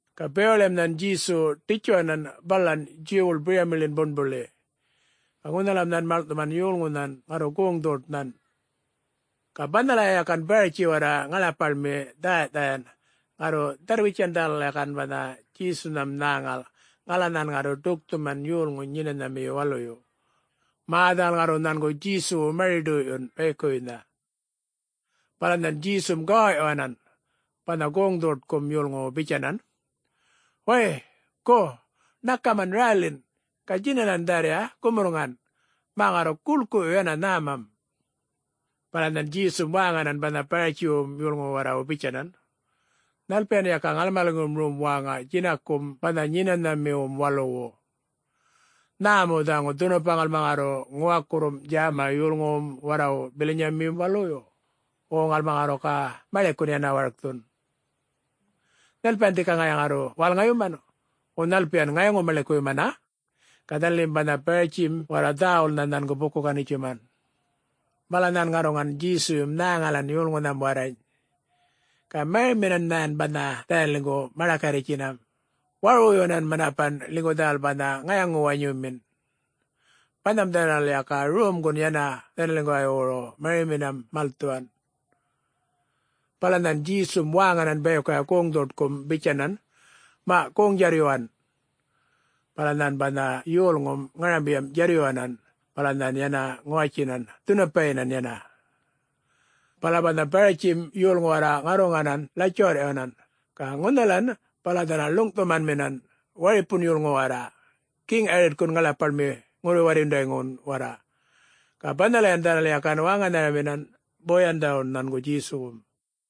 Ga bewaḻiyam nhan Djesu ḏitjuwanan balan Djuwwuḻ biryamiḻin buṉbuḻi. Ga ŋunhalam nhan maḻŋꞌthuman yolŋunhan ŋarru goŋ-dhoṯnhan. Ga banhalaya yakan Baratji warra ŋaḻapaḻmi dhäyaꞌdhayan ŋarru dharr-witjan dhanal yakan banha Djesunham nhäŋal ŋala nhan ŋarru ḏukthuman yolŋuny Nyenanhamiyu Waluyu, mä dhanal ŋarru nhangu Djesuwu mari-ḏoyꞌyun bayikuwuynha. Bala nhan Djesum gawawꞌyuwanan banha goŋ-dhoṯkum yolŋuwu bitjanan, “Wäy! Gu, ṉakaman rälin, ga djinalan dharriya gumurrŋan, mä ŋarru guḻkuyun yana nhämam.” Bala nhan Djesum wäŋanan banha Baratjiwum yolŋuwu warrawu bitjanan, “Nhalpiyan yaka ŋalmaliŋgum rom wäŋa djinakum banha Nyenanhamiwum Waluwu? Nhä mu dhaŋu dhunupa ŋalma ŋarru ŋuwakurrum djäma yolŋuwum warrawu bilanyayum waluyu, wo ŋalma ŋarru ga maḻikun yana warkthun? Nhalpiyan dhika ŋaya ŋarru wälŋayuman, wo nhalpiyan ŋayaŋu-maḻikuyumana,” Ga dhanalim banha Baratjim warra dhäwulnha nhangu buku-ganitjuman. Bala nhan ŋarruŋan Djesuyum nhäŋalan yolŋunham warrany, ga mariminan nhan banha dhanaliŋgu maḏakarritjinam, warwuyuwanan manapan ḻinygu dhanal banha ŋayaŋu-wanyumin. Banham dhanal yakan romgun yana dhanaliŋguwaywuru mariminam malthuwan. Bala nhan Djesum wäŋanan bayikuya goŋ-dhoṯkum bitjanan, “Maꞌ goŋ djarrꞌyuwan!” Bala nhan banha yolŋum ŋarambiyam djarryuwanan, bala nhan yana ŋuwatjinan dhunupayinan yana. Bala banha Baratjim yolŋu warra ŋarruŋanan ḻatjuwarrꞌyuwanan ga ŋunhalan bala dhanal ḻuŋꞌthumanminan waripun yolŋu warra, Geŋ Yaritkun ŋaḻapaḻmi ŋurru-warryundayŋun warra. Ga banhalayan dhanal yakan wäŋanharaminam boyandawun nhangu Djesuwum.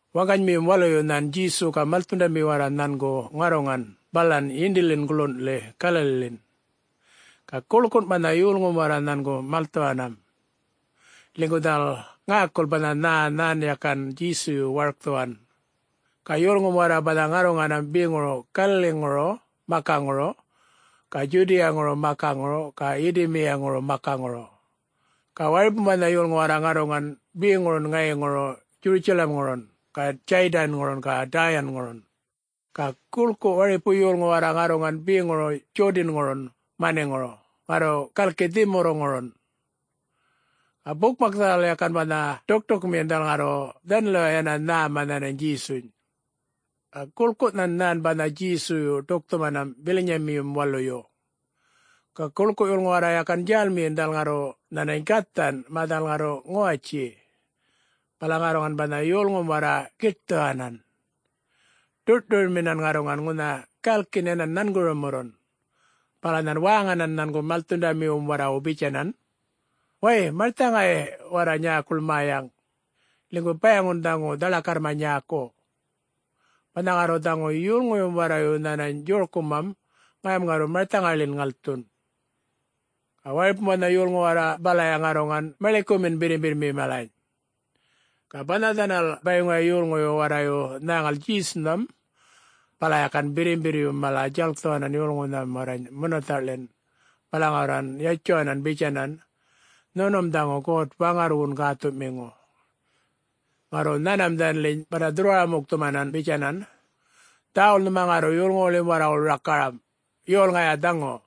Waŋganymiyum waluyu nhan Djesu ga malthundami warra nhanŋu ŋarruŋan balan yindiḻin guḻunꞌḻi Galaliḻin. Ga guḻkun banha yolŋum warra nhangu malthuwanam, ḻinygu dhanal ŋäkul banha nhä nhan yakan Djesuyu warkthuwan. Ga yolŋum warra banha ŋarruŋanam beŋuru Galaliŋuru makaŋuru ga Djudiyaŋuru makaŋuru ga Yidumiyaŋuru makaŋuru. Ga waripum banha yolŋu warra ŋarruŋan beŋurun ŋayiŋuru Djurutjalamŋurun ga Djaydanŋurun ga Däyaŋurun. Ga guḻku waripu yolŋu warra ŋarruŋan beŋuru Djodanŋurun maniŋuru ŋarru galiꞌ dhimurruŋurun. Ga bukmak dhanal yakan banha ḏuktukmiyinam dhanal ŋarru dhanaliway yana nhäma nhanany Djesuny. Ga guḻkunhan nhan banha Djesuyu ḏukthuman bilanyamiyum waluyu. Ga guḻku yolŋu warra yakan djälmiyin dhanal ŋarru nhanany gathan mä dhanal ŋarru ŋuwatji. Bala ŋarruŋan banha yolŋum warra giṯthuwanan, ḏurꞌṯuryunminan ŋarruŋan ŋunha galkin yanan nhangurumurrun, bala nhan wäŋanan nhangu malthundamiwum warrawu bitjanan, “Wäy, marthaŋay warra nyäkuḻ mäyaŋ, ḻinygu bayaŋun dhaŋu dhaḻakarrma nyäku. Banha ŋarru dhaŋu yolŋuyum warrayu nhänany djorkumam, ŋayam ŋarru marthaŋayḻin ŋalthun.” Ga waripum banha yolŋu warra balaya ŋarruŋan maḻikumin birrimbirrmi malany. Ga banha dhanal bayiŋuya yolŋuyu warrayu nhäŋal Djesunham, bala yakan birrimbirryum mala djalkthuwanan yolŋunham warrany munathaꞌḻin bala ŋarruŋan yatjuwanan bitjanan, “Nhunum dhaŋu God-Waŋarrwun Gäthuꞌmiŋu.” Ŋarru nhanmam dhanaliny banha dhurrwara-mukthumanan bitjanan, “Dhäwul nhuma ŋarru yolŋuwuḻim warrawuḻ rakaram, yol Ŋaya dhaŋu!”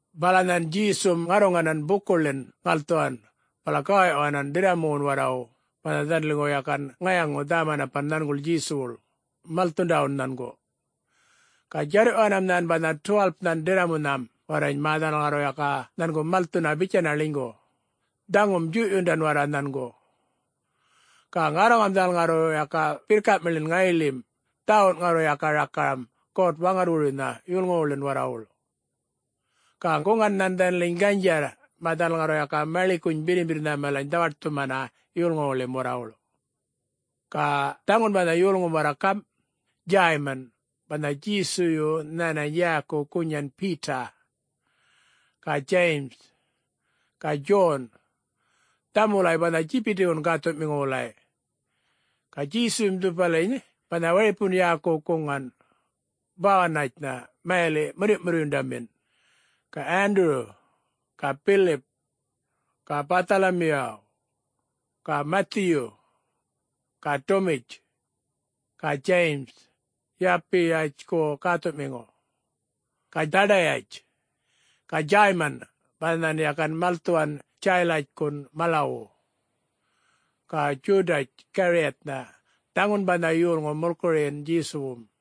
Bala nhan Djesum ŋarruŋanan bukuḻin ŋalthuwan bala gawawꞌyuwanan ḏirramuwun warrawu banha dhanaliŋgu yakan ŋayaŋu dhä-manapan nhanguḻ Djesuwuḻ, malthundawun nhangu. Ga djarrꞌyuwanam nhan banha 12-nhan ḏirramunham warrany mä dhanal ŋarru yaka nhangu malthuna bitjana ḻinygu, dhaŋum djuyꞌyundan warra nhangu. Ga ŋarruŋam dhanal ŋarru yaka birrkamiḻin ŋayiḻim dhäwun ŋarru yaka rakaram God-Waŋarrwuruynha yolŋuwuḻin warrawuḻ. Ga guŋan nhan dhanaliny ganydjarr, mä dhanal ŋarru yaka maḻikuny birrimbirrnha malany dhawaṯthumana yolŋuwuḻim warrawuḻ. Ga dhaŋu banha yolŋum warra gamꞌ: Djäyman (banha Djesuyu nhanany yäku gunyan Beta), ga Djayim, ga Djon, dhaŋum wulay banha Djibidiwun gäthuꞌmiŋu wulay. (Ga Djesuyum dhupaliny banha waripun yäku guŋan, ‘Bawunatjnha’ mayaliꞌ ‘Murryuꞌmurryundamin’.) ga Wanduru, ga Bilip, ga Bäthalamiyaw, ga Mathiyu, ga Dumitj, ga Djayim (Yalpiyatjku gäthuꞌmiŋu), ga Dhadayatj, ga Djäyman, (banha nhan yakan malthuwan Djalatkun malawu), ga Djudatj Gariyatnha (dhaŋun banha yolŋu mulkuruyin Djesuwum.)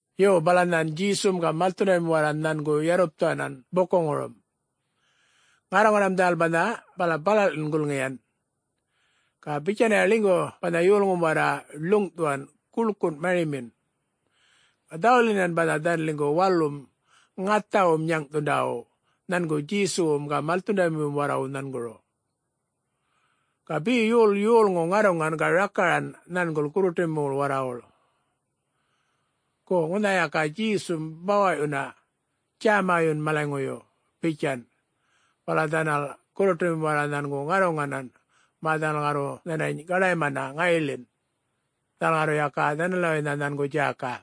Yo, bala nhan Djesum ga malthundamim warra nhangu yarrupthuwanan bukuŋurum. Ŋarruŋanam dhanal banha bala buṉbuḻin gulŋiyan. Ga bitjanaya ḻinygu banha yolŋum warra ḻuŋꞌthuwan guḻkun marimin, ga dhäwulyinan banha dhanaliŋgu walum ŋathawum nyäŋꞌthundawu nhangu Djesuwum ga malthundamiwum warrawu nhanguru. Ga be yol yolŋu ŋarruŋan ga rakaran nhanguḻ gurruṯumiwuḻ warrawuḻ, “Gu ŋunha yaka Djesum bawaꞌyuna, djämayun malaŋuyu!” bitjan. Bala dhanal gurruṯumim warra nhangu ŋarruŋanan mä dhanal ŋarru nhanany gaḏaymana ŋayiḻin. Dhanal ŋarru yaka dhanaliwaynha nhangu djäka.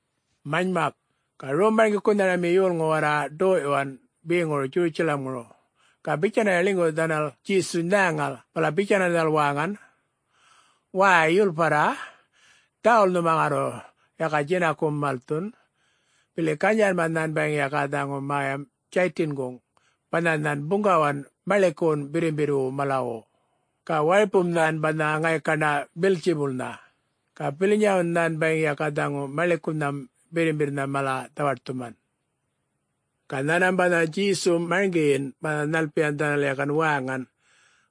Manymak, ga rom-marŋgikunhami yolŋu warra ḏoyꞌyuwan beŋuru Djurutjalamŋuru ga bitjanaya ḻinygu dhanal Djesuny nhäŋal, bala bitjanan dhanal wäŋan, “Wäy, yulparra, dhäwul nhuma ŋarru yaka djinakum malthun, bili ganydjarrma nhan bayiŋ yaka dhaŋu mäyam Djaytinguŋ banha nhan buŋgawan maḻikuwun birrimbirrwu malawu, ga waripum nhan banha ŋaykaṉa Beltjibulnha. Ga bilanyawun nhan bayiŋ yaka dhaŋu maḻikunham birrimbirrnha mala dhawaṯthuman.” Ga nhanmam banha Djesum marŋgiyin banha nhalpiyan dhanal yakan wäŋan,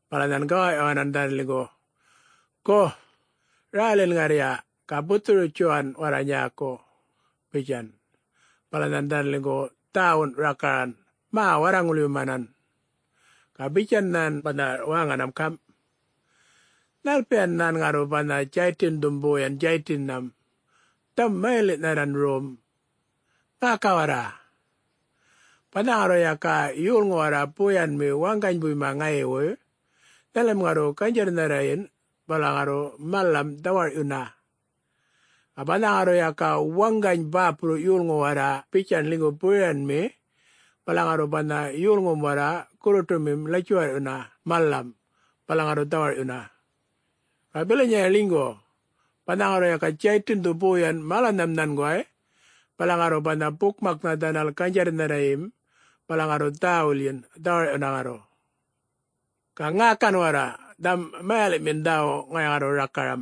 bala nhan gawaꞌyuwanan dhanaliŋgu, “Gu, rälin ŋarrya ga buthuru-witjuwa warra nyäku,” bitjan. Bala nhan dhanaliŋgu dhäwun rakaran mä warraŋulyumanan. Ga bitjan nhan banha wäŋanam gamꞌ, “Nhalpiyana nhan ŋarru banha Djaytindhum boyan Djaytinnham? Dhaŋum mayaliꞌnharran rom. Ŋäka warra! Banha ŋarru yaka yolŋu warra boyanmi waŋganybuyma ŋayiwuy, dhanalim ŋarru ganydjarrnharrayin bala ŋarru malam dhawarꞌyuna. Ga banha ŋarru yaka waŋgany bäpurru yolŋu warra bitjan ḻinygu boyanmi, bala ŋarru banha yolŋum warra gurruṯumim latjuwarryuna malam, bala ŋarru dhawarꞌyuna. Ga bilayaya ḻinygu, banha ŋarru yaka Djaytindhu boyan malanham nhanguway, bala ŋarru banha bukmaknha dhanal ganydjarrnharrayim bala ŋarru dhäwulyin, dhawarꞌyuna ŋarru! Ga ŋäkan warra dhaŋum mayaliꞌmin dhäwu ŋaya ŋarru rakaram: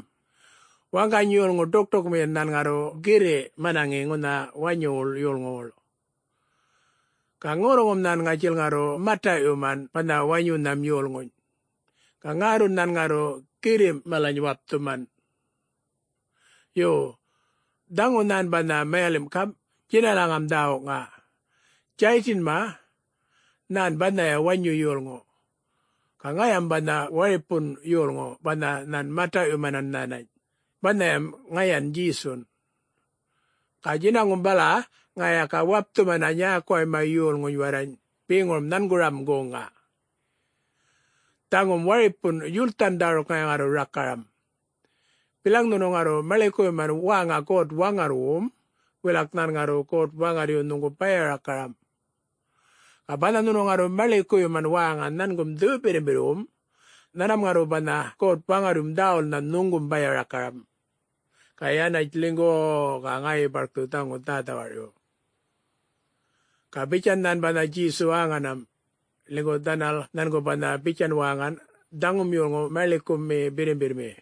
Waŋgany yolŋu ḏukṯukmiyin nhan ŋarru girriꞌ manaŋi ŋunha wanyuwuḻ yolŋuwuḻ. Ga ŋurruŋum nhan ŋatjil ŋarru mataꞌyuman banha wanyunham yolŋuny, ga ŋärrun nhan ŋarru girrimꞌ malany wapthuman. [Yo, dhaŋu nhan banha mayalimꞌ gamꞌ djinalaŋam dhäwuŋa: Djaytinma, nhän banhaya wanyu yolŋu, ga ŋayam banha waripun yolŋu banha nhan mataꞌyumanan nhanany, banhayam ŋayan Djesun. Ga djinaŋum bala ŋaya yaka wapthumana nyäkuwayma yolŋuny warrany beŋurum nhangurum goŋŋa.] Dhaŋum waripun yulthan dhäruk ŋaya ŋarru rakaram: Bilaŋ nhunu ŋarru maḻikuyuman wäŋa God-Waŋarrwum, wilak nhan ŋarru God-Waŋarryu nhuŋgu baya-rakaram. Ga banha nhunu ŋarru maḻikuyuman wäŋa nhangum Dhuyu-Birrimbirrwum, nhanmam ŋarru banha God-Waŋarryum dhäwulnha nhuŋgum baya-rakaram, ga yanatj ḻinygu-u-u ga ŋayi barkthu dhaŋu dhä-dhawarꞌyu!” Ga bitjan nhan banha Djesu wäŋanam, ḻinygu dhanal nhangu banha bitjan wäŋan, “Dhaŋum yolŋu maḻikumi birrimbirrmi.”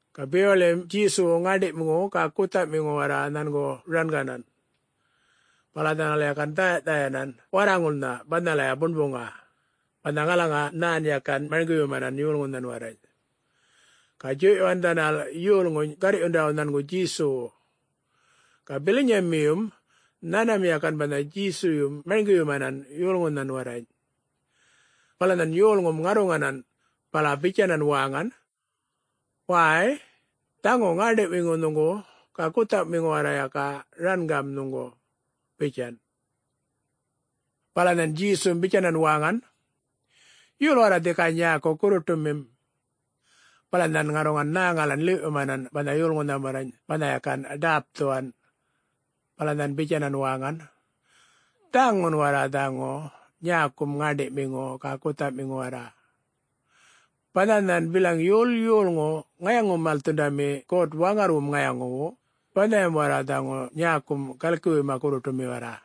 Ga bewaḻiyam Djesuwu ŋäṉḏiꞌmiŋu ga guthaꞌmiŋu warra nhangu ranganan. Bala dhanal yakan dhäyaꞌdhayanan warraŋulnha banhalaya buṉbuŋa, banha ŋalaŋa nhan yakan marŋgiyumanan yolŋuny warrany. Ga djuyꞌyuwan dhanal yolŋuny garrꞌyundawu nhangu Djesuwu. Ga bilanymiyum nhanmam yakan banha Djesuyum marŋgiyumanan yolŋunhan warrany. Bala nhan yolŋum ŋarruŋanan, bala bitjanan wäŋan, “Wäy! Dhaŋu ŋäṉḏiꞌmiŋu nhuŋgu ga guthaꞌmiŋu warra yaka rangam nhuŋgu,” bitjan. Bala nhan Djesum bitjanan wäŋan, “Yol warra dhika nyäku gurruṯumim?” Bala nhan ŋarruŋan nhäŋalan ḻiwꞌyumanan banha yolŋunham warrany banha yakan ḏäpthuwan. Bala nhan bitjanan wäŋan, “Dhaŋun warra dhaŋu nyäkum ŋäṉḏiꞌmiŋu ga guthaꞌmiŋu warra. Banha nhan bilaŋ yol yolŋu ŋayaŋu-malthundami God-Waŋarrwum ŋayaŋuwu, banhayan warra dhaŋu nyäkum galkiwuyma gurruṯumi warra.”